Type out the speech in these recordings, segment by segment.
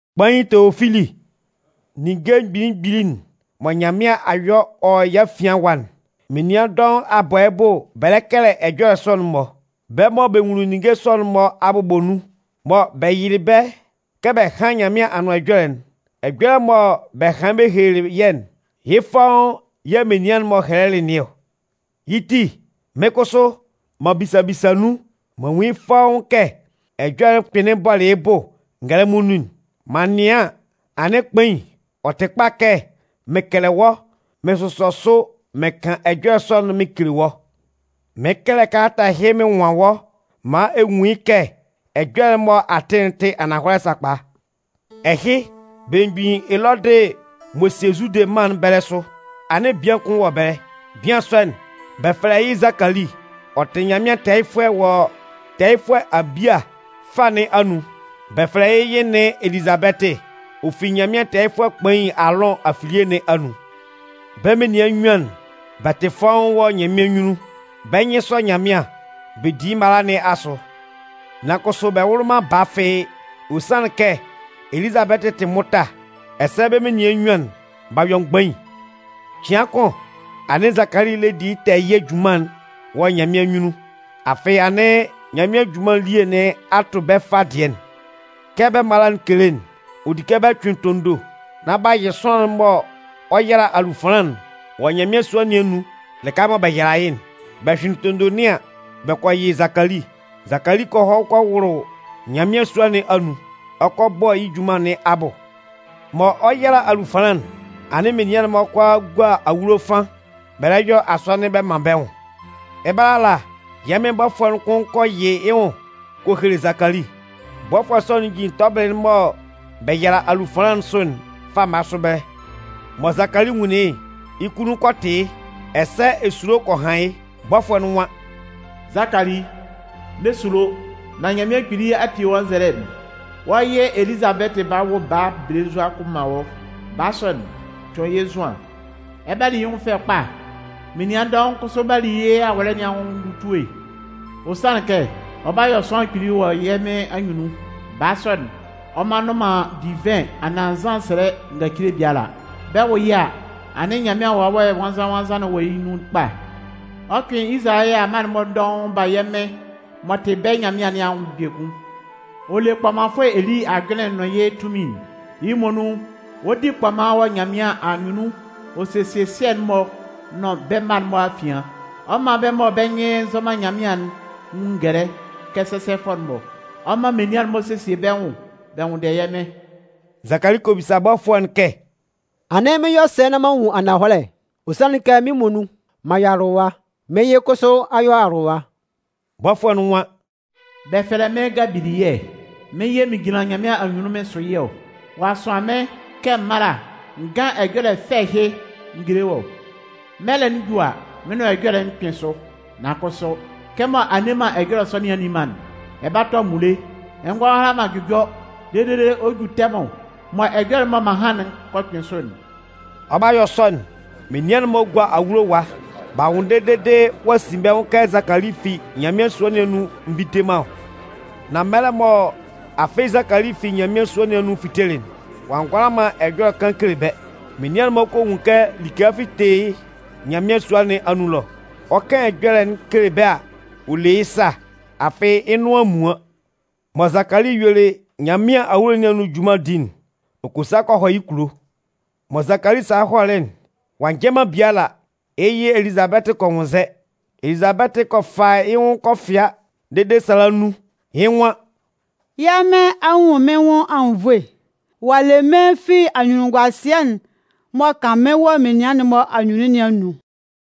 Kpain Teofili, Ninnge mgbili mgbili'n mɔ Nyanmɩan a yɔ wɔ yɛ́ afian ɛwa'n, menian dɔʋn a bɔ yɩ́ bʋ bɛ lɛ kɛlɛ ɛjɔlɛ sɔ'n-mɔ. Bɛ́ mɔ bɛ nwunlin ninnge sɔ'n-mɔ abʋbɔ nun, mɔ bɛ yɩlɩ bɛ́ kɛ bɛ hán Nyanmɩan Anʋan Ɛjɔlɛ'n, ɛjɔlɛ mɔ bɛ hanlɩn bɛ helelɩ yɛ́'n, yɩ́ fɔ́ʋ́n yɛ̂ menian'n-mɔ hɛlɛlɩ nɩn ɔ. Yɩ́ ti, mɩ́n kʋsʋ, m'an bisa bisa nun m'an nwun yɩ́ fɔ́ʋ́n kɛ ɛjɔlɛ'n kpɩnlɩn bɔlɩ yɩ́ bʋ ngɛlɛmɔ nun'n. M'an nɩan an, anɩn Kpain, ɔ tɩ kpa kɛ mɩn kɛlɛ wɔ́ mɩn sʋsɔ sʋ mɩn kan ɛjɔlɛ sɔ'n mɩn kele wɔ́. Mɩɩn kɛlɛ kalata ɛhɩ mɩn nwan wɔ́ maan ɛ nwun yɩ́ kɛ ɛjɔlɛ'n mɔ a tɩ'n tɩ ananhɔlɛ sakpa. Ɛhɩ, belemgbin Elɔdɩ m'ɔ sie Zude mân'n bɛlɛ sʋ, anɩn bian kʋn wɔ ɛbɛlɛ. Bian sɔ'n, bɛ fɛlɛ yɩ́ Zakali. Ɔ tɩ Nyanmɩan tɛɛyɩfʋɛ wɔ tɛɛyɩfʋɛ Abia fâ nɩn anun. Bɛ fɛlɛ yɩ́ yɩ nɩn Elizabɛtɩ, ɔ fi Nyanmɩan tɛɛyɩfʋɛ kpain Aalʋn afilie nɩn anun. Bɛ́ menian nnyuan'n, bɛ tɩ fɔ́ʋ́n wɔ Nyanmɩan anyunnun. Bɛ́ nyɩn sɔ Nyanmɩan. Bɛ di yɩ́ mala nɩn asʋ. Nan kʋsʋ bɛ wʋlɩ man baa fɩ́ɩ́, ɔ sanlɩn kɛ Elizabɛtɩ tɩ mʋta, ɛsɛ bɛ́ menian nnyuan'n b'a yɔ mgbain. Cɩan kʋn, anɩn Zakali lɛ di yɩ́ tɛɛyɩɛ junman'n wɔ Nyanmɩan anyunnun, afɩ anɩn Nyanmɩan junman elie nɩn a tʋ bɛ́ fâ dɩɛ'n. Kɛ bɛ́ mala'n kele'n, ɔ di kɛ bɛ cʋɩn tondo nán bɛ yɩ sʋanlan'n mɔ ɔ 'yala alufanlan'n wɔ Nyanmɩan sua nɩn anun lɩka mɔ bɛ yala yɩ́'n. Bɛ hyʋɩnlɩn tondo nɩn an, bɛ kɔ yɩ Zakali. Zakali kɔ hɔ kɔ wʋlʋ Nyanmɩan sua nɩn anun, ɔ kɔ bɔ yɩ́ junman nɩn abʋ. Mɔ ɔ 'yala alufanlan'n, anɩn menian'n-mɔ kʋalaa gua awulo ɛfan bɛ lɛ yɔ asɔnɩn bɛ man bɛ́ nwʋn. Ɛbɛlɛ ala, yɛ́ Mɩn bɔfʋɛ'n kʋn kɔ yɩ yɩ́ nwʋn kɔ hele Zakali. Bɔfʋɛ sɔ'n jin tɔbɩlɩ'n mɔ bɛ yala alufanlan'n sʋ'n fama sʋ ɛbɛlɛ. Mɔ Zakali nwunlin yɩ́'n, yɩ́ kunnun kɔ tɩ yɩ́, ɛsɛ esulo kɔ han yɩ́. Bɔfʋɛ'n nwan: “Zakali, n'ɛ sulo! Nan Nyanmɩan Kpili a tie wɔ́ nzɛlɛ'n. Wɔ́ yɩ Elizabɛtɩ 'ba wʋ baa belenzua kʋn man wɔ́. Baa sɔ'n, tʋn yɩ́ Zʋan. Ɛ 'ba li yɩ́ nwʋn fɛ kpa, menian dɔʋn kʋsʋ 'ba li yɩ́ awɔlɛ nɩn anwʋn ndutue. Ɔ sanlɩn kɛ ɔ 'ba yɔ sʋanlan kpili wɔ yɛ́ Mɩn anyunnun. Baa sɔ'n, ɔ mma nnʋn man divɩn anaan nzan sɛlɛ ngacile biala. Bɛ 'wʋ yɩ́ a, anɩn Nyanmɩan Wawɛ Nwannzan-nwannzan wɔ yɩ́ nun kpa. Ɔ 'cʋɩn Izalayɛ amma'n-mɔ dɔʋn ba yɛ́ Mɩn m'ɔ tɩ bɛ́ Nyanmɩan nɩn anwʋn biekun. Ɔ le kpɔmanfʋɛ Eli ajʋnlɩn'n nʋn yɩ́ tunmin'n, yɩ́ muonun ɔ 'di kpɔman wɔ Nyanmɩan anyunnun ɔ sesie sɩɛ'n-mɔ nʋn bɛ́ mma'n-mɔ afian. Ɔ 'man bɛ́ mɔ bɛ́ nyɩn nzɔ man Nyanmɩan'n nwun ngɛlɛ kɛ sɛsɛfʋɛ'n-mɔ. Ɔ 'man menian'n-mɔ sesie bɛ́ nwʋn bɛ nwʋnndɛ yɛ́ Mɩ́n.” Zakali kɔ bisa bɔfʋɛ'n kɛ: “Anɩn, mɩn 'yɔ sɛ nán m'an nwun yɩ́ ananhɔlɛ. Ɔ sanlɩn kɛ mɩ́n muonun, m'an yɔ awʋlʋwa. Mɩ́n yɩ kʋsʋ a yɔ awʋlʋwa.” Bɔfʋɛ'n nwan: “Bɛ fɛlɛ mɩ́n Gabiliyɛ. Mɩ́n yɛ̂ mɩn jinlan Nyanmɩan anyunnun mɩn sʋ yɩ́ ɔ. Ɔ'a sʋan mɩ́n kɛ m mála n gán ɛjɔlɛ fɛ ɛhɩ n géle wɔ́. Mɛlɛ'n ju a, mɩ́n nʋan ɛjɔlɛ'n 'kpɩn sʋ. Nan kʋsʋ, kɛmɔ a nne man ɛjɔlɛ sɔ nɩn a nni man'n, ɛ 'ba tɔ amunle, ɛ ngɔ hʋala man jʋjɔ dede ɔ 'ju tɛmʋn mɔ ɛjɔlɛ'n mɔ m'an han'n kɔ kpɩn sʋ'n.” Ɔ 'ba yɔ sɔ'n, menian'n-mɔ gua awulo ɛwa b'a nwʋnndɛ dede ɔ'a sin bɛ́ nwʋn kɛ Zakali fi Nyanmɩan sua nɩn anun nvite man ɔ. Nan mɛlɛ mɔ afɩ Zakali fi Nyanmɩan sua nɩn anun fitelɩ'n, ɔ a ngʋala man ɛjɔlɛ kan kele bɛ́. Menian'n-mɔ kɔ nwun kɛ like a fite yɩ́ Nyanmɩan sua nɩn anun ɛlɔ. Ɔ 'kan ɛjɔlɛ'n kele bɛ́ a, ɔ le yɩ́ sa, afɩ yɩ́ nʋan a muan. Mɔ Zakali yuelɩ Nyanmɩan awulo nɩn anun junman'n di'n, ɔ kɔ sa kɔ hɔ yɩ́ kulo. Mɔ Zakali salɩ hɔlɩ'n, ɔ'a njɛ man biala, yɩ́ yɩ Elizabɛtɩ kɔ nwʋnnzɛ. Elizabɛtɩ kɔ fa yɩ́ nwʋn kɔ fɩa dede sala nnun. Yɩ́ nwan: “Yɛ́ Mɩn a nwun mɩ́n nwʋn anwunnvoe. Ɔ'a le mɩ́n fi anyunnunguasɩɛ'n m'ɔ kan mɩ́n wɔ menian'n-mɔ anyunnun nɩn anun.”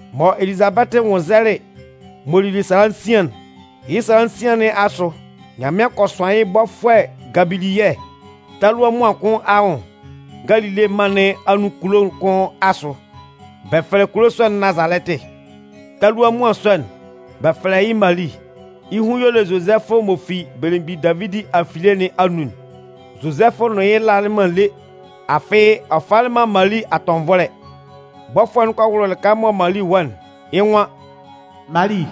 Mɔ Elizabɛtɩ nwʋnnzɛlɩ m'ɔ lili sala nsian'n, yɩ́ sala nsian nɩn asʋ, Nyanmɩan kɔ sʋan yɩ́ bɔfʋɛ Gabiliyɛ talua muan kʋn anwʋn Galile mân nɩn anun kulo'n kʋn asʋ. Bɛ fɛlɛ kulo sɔ'n Nazalɛtɩ. Talua muan sɔ'n, bɛ fɛlɛ yɩ́ Mali. Yɩ́ hun y'ɔ le Zozɛfʋ m'ɔ fi belemgbin Davidi afilie nɩn anun'n. Zozɛfʋ nʋn yɩ́ lalɩ man lé. Afɩ ɔ falɩ man Mali atɔnvɔlɛ. Bɔfʋɛ'n kɔ wʋlʋ lɩka mɔ Mali wɔ'n, yɩ́ nwan: “Mali,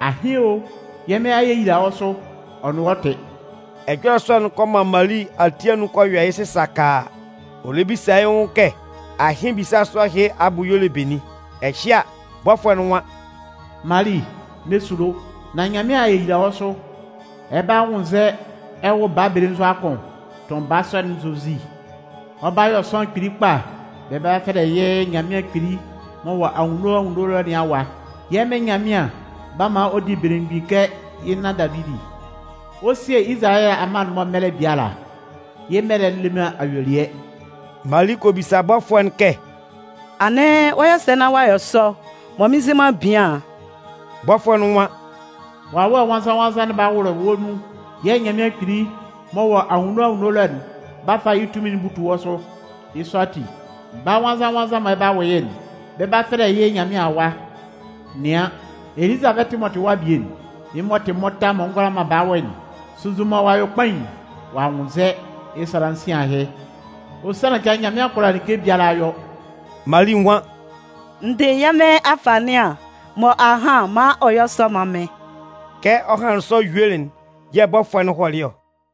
ahɩn o! Yɛ́ Mɩn a yeyila wɔ́ sʋ, ɔ nʋn wɔ́ tɩ.” Ɛjɔlɛ sɔ'n kɔ man Mali ati anun kɔ yɔ yɩ́ sɩsakaa. Ɔ lɛ bisa yɩ́ nwʋn kɛ ahɩn ebisa sɔ ɛhɩ abʋ y'ɔ le benin? Ɛhɩ a, bɔfʋɛ'n nwan: “Mali, n'ɛ sulo! Nan Nyanmɩan a yeyila wɔ́ sʋ. Ɛ 'ba nwʋnnzɛ ɛ wʋ baa belenzua kʋn. Tʋn baa sɔ'n Zozi. Ɔ 'ba yɔ sʋanlan kpili kpa, bɛ 'ba fɛlɛ yɩ́ Nyanmɩan Kpili m'ɔ wɔ anwunno anwunno ɛlɔ nɩn Awa. Yɛ́ Mɩn Nyanmɩan 'ba man ɔ di belemgbin kɛ yɩ́ nan Davidi. Ɔ 'sie Izalayɛ amma'n-mɔ mɛlɛ biala. Yɩ́ mɛlɛ'n le man ayuelɩɛ.” Mali kɔ bisa bɔfʋɛ'n kɛ: “Anɩn, ɔ 'yɔ sɛ nán ɔ'a yɔ sɔ, mɔ mɩn nzɩ man bian'n?” Bɔfʋɛ'n nwan: “Wawɛ Nwannzan-nwannzan'n 'ba wʋlʋ wɔ́ nun yɛ̂ Nyanmɩan Kpili m'ɔ wɔ anwunno anwunno ɛlɔ'n 'ba fa yɩ́ tunmin'n butu wɔ́ sʋ. Yɩ́ sɔ ati, baa nwannzan-nwannzan'n mɔ ɛ 'ba wʋ yɩ́'n, bɛ 'ba fɛlɛ yɩ́ Nyanmɩan Awa. Nɩan, Elizabɛtɩ m'ɔ tɩ wɔ́ abie'n, yɩ́ m'ɔ tɩ mʋta m'ɔ ngʋala man baa wʋ'n, sunnzun mɔ ɔ'a yɔ kpain, ɔ'a nwʋnnzɛ, yɩ́ sala nsian ahɩ. Ɔ sanlɩn kɛ Nyanmɩan kʋala like biala yɔ.” Mali nwan: “N dɩ yɛ́ Mɩn afanɩan, mɔ a han'n, man ɔ yɔ́ sɔ mán mɩ́n.” Kɛ ɔ hanlɩn sɔ yuelɩ'n yɛ̂ bɔfʋɛ'n hɔlɩ ɔ.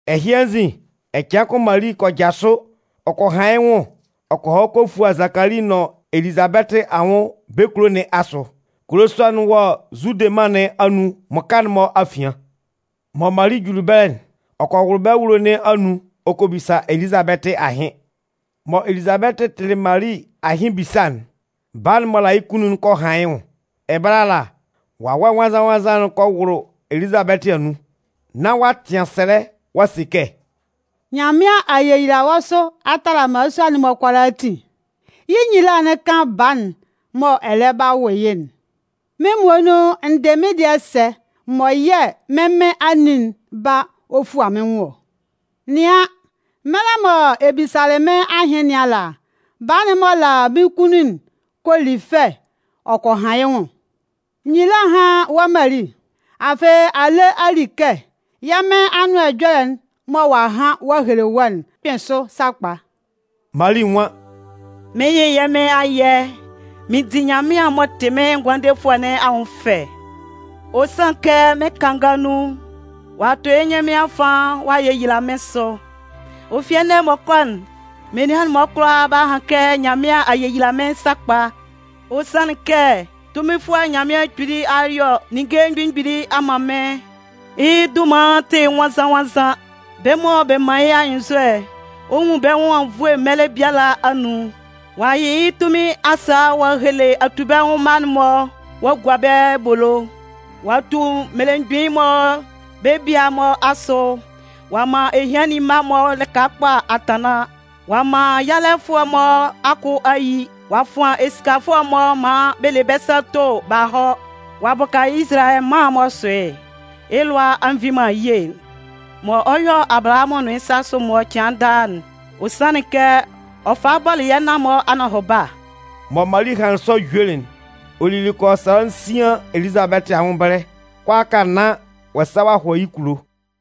Ɛhɩ anzin, ɛcɩan kʋn Mali kɔ jasʋ ɔ kɔ han yɩ́ nwʋn ɔ kɔ hɔ kɔ fua Zakali nʋn Elizabɛtɩ anwʋn bɛ́ kulo nɩn asʋ. Kulo sɔ'n wɔ Zude mân nɩn anun mmʋka'n-mɔ afian. Mɔ Mali juli ɛbɛlɛ'n, ɔ kɔ wʋlʋ bɛ́ awulo nɩn anun ɔ kɔ bisa Elizabɛtɩ ahɩn. Mɔ Elizabɛtɩ tɩlɩ Mali ahɩn ebisa'n, baa'n m'ɔ la yɩ́ kunnun'n kɔ han yɩ́ nwʋn. Ɛbɛlɛ ala, Wawɛ Nwannzan-nwannzan'n kɔ wʋlʋ Elizabɛtɩ anun. Nán ɔ'a tɩan sɛlɛ ɔ'a se kɛ: “Nyanmɩan a yeyila wɔ́ sʋ a tala mmalasua'n-mɔ kʋalaatin. Yɩ́ nyila'n kan baa'n mɔ ɛ lɛ 'ba wʋ yɩ́'n. Mɩ́n muonun, n dɩ mɩ́n dɩɛ sɛ mɔ yɛ̂ mɩ́n Mɩn anin'n ba ɔ fua mɩ́n nwʋn ɔ? Nɩan, mɛlɛ mɔ ɛ bisalɩ mɩ́n ahɩn nɩn ala, baa'n m'ɔ la mɩ́n kunnun'n kɔ li fɛ ɔ kɔ han yɩ́ nwʋn. Nyila hán wɔ́ Mali. Afɩ a le a li kɛ yɛ́ Mɩn Anʋan Ɛjɔlɛ'n mɔ ɔ'a han ɔ'a hele wɔ́'n 'kpɩn sʋ sakpa!” Mali nwan: “Mɩn 'yɩ yɛ́ Mɩn ayɛ. Mɩn di Nyanmɩan m'ɔ tɩ mɩ́n Ngʋandefʋɛ nɩn anwʋn fɛ. Ɔ sanlɩn kɛ mɩ́n kanga nun, ɔ'a tʋ yɩ́ nyɩn mɩ́n afan ɔ'a yeyila mɩ́n sʋ. Ɔ fi ɛnɛ m'ɔ kɔ'n, menian'n-mɔ kʋalaa 'ba han kɛ Nyanmɩan a yeyila mɩ́n sakpa. Ɔ sanlɩn kɛ Tunminfʋɛ Nyanmɩan Kpili a yɔ ninnge mgbili mgbili a man mɩ́n. Yɩ́ dunman'n tɩ nwannzan-nwannzan. Bɛ́ mɔ bɛ man yɩ́ anyɩnnzɔ'n, ɔ 'nwun bɛ́ nwʋn anwunnvoe mɛlɛ biala anun. Ɔ'a yɩ yɩ́ tunmin asa'n ɔ'a hele atubɛnwʋn mma'n-mɔ ɔ'a gua bɛ́ ebolo. Ɔ'a tu mmelemgbin'n-mɔ bɛ́ bia'n-mɔ asʋ, ɔ'a man ehiannin mma'n-mɔ lɩka kpa a tanlan. Ɔ'a man yalɛfʋɛ'n-mɔ akʋ a yi, ɔ'a fʋan esikafʋɛ'n-mɔ maan bɛ le bɛ́ sa to b'a hɔ. Ɔ'a bʋka Izalayɛ mân'n m'ɔ sʋ yɩ́'n. Yɩ́ lʋa a nvi man ye'n mɔ ɔ 'yɔ Abalahamʋn nʋn yɩ́ sasʋ'n-mɔ cɩan daa'n. Ɔ sanlɩn kɛ ɔ falɩ bɔlɩ yɛ́ nan-mɔ anɔhʋba.” Mɔ Mali hanlɩn sɔ yuelɩ'n, ɔ lili kɔ yɔ sala nsan Elizabɛtɩ anwʋn ɛbɛlɛ kʋalaaka nán ɔ'a sa ɔ'a hɔ yɩ́ kulo.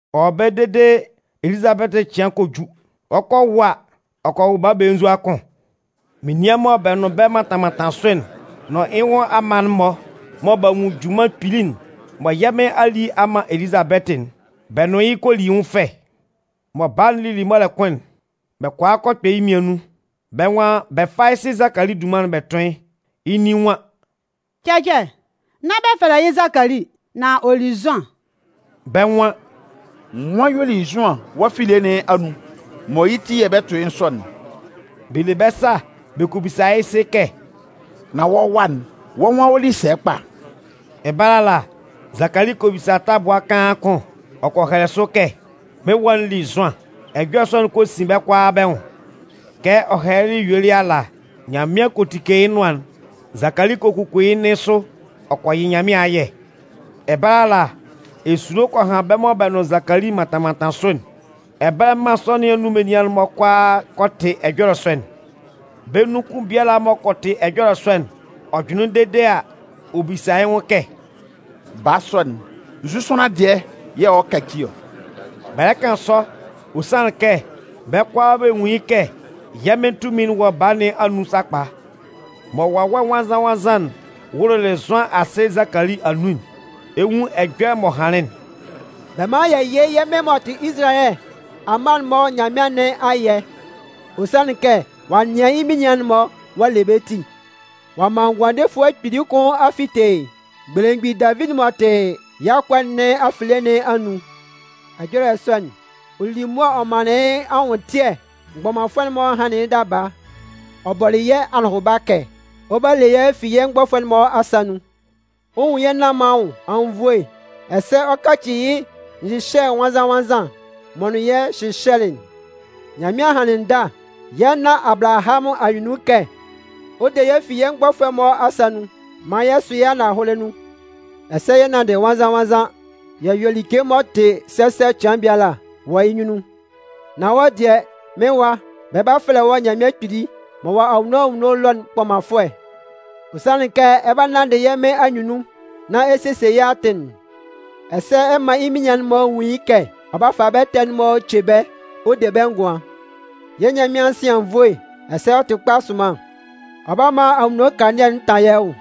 Ɔ wɔ ɛbɛlɛ dede Elizabɛtɩ cɩan kɔ ju. Ɔ 'kɔ a wʋ a, ɔ kɔ wʋ baa belenzua kʋn. Menian mɔ bɛ nʋn bɛ́ mantan mantan sʋ'n nʋn yɩ́ nwʋn amma'n-mɔ mɔ b'a nwun junman kpili'n mɔ yɛ́ Mɩn a li a man Elizabɛtɩ'n, bɛ nʋn yɩ́ kɔ li yɩ́ nwʋn fɛ. Mɔ Baa'n lili mɔlɛ kʋn'n, bɛ kɔ a kɔ kpɛ yɩ́ mmian nun. Bɛ́ nwan bɛ 'fa yɩ́ sɩ Zakali dunman'n bɛ tʋn yɩ́. Yɩ́ nin nwan: “Cɛcɛ, nán bɛ fɛlɛ yɩ́ Zakali, nan ɔ li Zʋan.” Bɛ́ nwan: “Nwan yɛ̂ ɔ li Zʋan wɔ́ afilie nɩn anun mɔ yɩ́ ti yɛ̂ bɛ 'tʋn yɩ́ sɔ'n?” Bɛ le bɛ́ sa bɛ kɔ bisa yɩ́ sɩ kɛ: “Nan wɔ́ wa'n, wɔ́ nwan ɔ li sɛ kpa?” Ɛbɛlɛ ala, Zakali kɔ bisa tabʋa kaan kʋn ɔ kɔ hɛlɛ sʋ kɛ: “Mɩ́n wa'n li Zʋan.” Ɛjɔlɛ sɔ'n kɔ sin bɛ́ kʋalaa bɛ́ nwʋn. Kɛ ɔ hɛlɛlɩ yuelɩ ala, Nyanmɩan kɔ tike yɩ́ nʋan'n. Zakali kɔ kuku yɩ́ nɩn sʋ ɔ kɔ yɩ Nyanmɩan ayɛ. Ɛbɛlɛ ala, esulo kɔ han bɛ́ mɔ bɛ nʋn Zakali mantan mantan sʋ'n, ɛbɛlɛ mân sɔ nɩn anun menian'n-mɔ kʋalaa kɔ tɩ ɛjɔlɛ sɔ'n. Bɛ́ nun kʋn biala m'ɔ kɔ tɩ ɛjɔlɛ sɔ'n, ɔ jʋnlɩn dede a, ɔ bisa yɩ́ nwʋn kɛ: “Baa sɔ'n, nzu sʋanlan dɩɛ yɛ̂ ɔ 'kaci ɔ?” Bɛ lɛ kan sɔ, ɔ sanlɩn kɛ bɛ́ kʋalaa bɛ nwun yɩ́ kɛ yɛ́ Mɩn tunmin'n wɔ baa nɩn anun sakpa. Mɔ Wawɛ Nwannzan-nwannzan'n wʋlʋlɩ Zʋan asɩ Zakali anun'n, ɛ 'nwun ɛjɔlɛ m'ɔ hanlɩn'n: “Bɛ mán yɛ yɩ́ yɛ́ Mɩn m'ɔ tɩ Izalayɛ amma'n-mɔ Nyanmɩan nɩn ayɛ. Ɔ sanlɩn kɛ ɔ'a nɩan yɩ́ menian'n-mɔ ɔ'a le bɛ́ ti. Ɔ'a man ngʋandefʋɛ kpili kʋn a fite belemgbin Davidi m'ɔ tɩ yɩ́ akʋa nɩn afilie nɩn anun. Ɛjɔlɛ sɔ'n, ɔ lili mʋa ɔ manlɩn yɩ́ anwʋntɩɛ mgbɔmanfʋɛ'n-mɔ hanlɩn yɩ́ daba. Ɔ bɔlɩ yɛ́ anɔhʋba kɛ ɔ 'ba le yɛ́ fi yɛ́ mgbɔfʋɛ'n-mɔ asa nun, ɔ 'nwun yɛ́ nan-mɔ anwʋn anwunnvoe, ɛsɛ ɔ 'kacɩ yɩ́ nyɩhyɛ nwannzan-nwannzan'n m'ɔ nʋn yɛ́ hyɩhyɛlɩ'n. Nyanmɩan hanlɩn ndâ yɛ́ nan Abalahamʋn anyunnun kɛ ɔ 'de yɛ́ fi yɛ́ mgbɔfʋɛ'n-mɔ asa nun, maan yɛ sʋ yɩ́ ahʋnmɩnkan nun, ɛsɛ yɛ 'nanndɩ nwannzan-nwannzan yɛ yɔ like m'ɔ tɩ sɛsɛ cɩan biala wɔ yɩ́ nyunnun. Nan wɔ́ dɩɛ, mɩ́n wa, bɛ 'ba fɛlɛ wɔ́ Nyanmɩan Kpili m'ɔ wɔ anwunno anwunno ɛlɔ'n kpɔmanfʋɛ. Ɔ sanlɩn kɛ ɛ 'ba nanndɩ yɛ́ Mɩn anyunnun nán ɛ sesie yɩ́ atɩn'n, ɛsɛ ɛ 'man yɩ́ menian'n-mɔ nwun yɩ́ kɛ ɔ 'ba fa bɛ́ ɛtɛ'n-mɔ ce bɛ́ ɔ de bɛ́ ngʋan. Yɛ́ Nyanmɩan'n sɩ anwunnvoe, ɛsɛ ɔ tɩ kpa sʋnman. Ɔ 'ba man anwunno kanlannɩɛ'n ta yɛ́ nwʋn.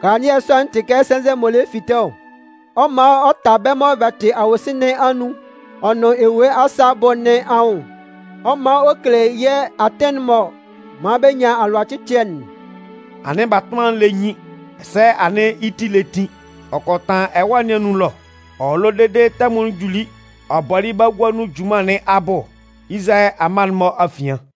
Kanlannɩɛ sɔ'n tɩ kɛ sɛnzɛ m'ɔ lɛ fite ɔ. Ɔ 'man ɔ ta bɛ́ mɔ bɛ tɩ awosin nɩn anun ɔ nʋn ewue asa abʋ nɩn anwʋn. Ɔ 'man ɔ kele yɛ́ atɩn'n m'ɔ man bɛ nyan alʋacɩcɩɛ'n.” Anɩn batʋnman'n lɛ nyin ɛsɛ anɩn yɩ́ ti lɛ tin. Ɔ kɔ tanlan ɛwâ nɩn anun ɛlɔ. Ɔ wɔ ɛlɔ dede tɛmʋn'n juli ɔ bɔlɩ yɩ́ bagua nun junman nɩn abʋ Izalayɛ amma'n-mɔ afian.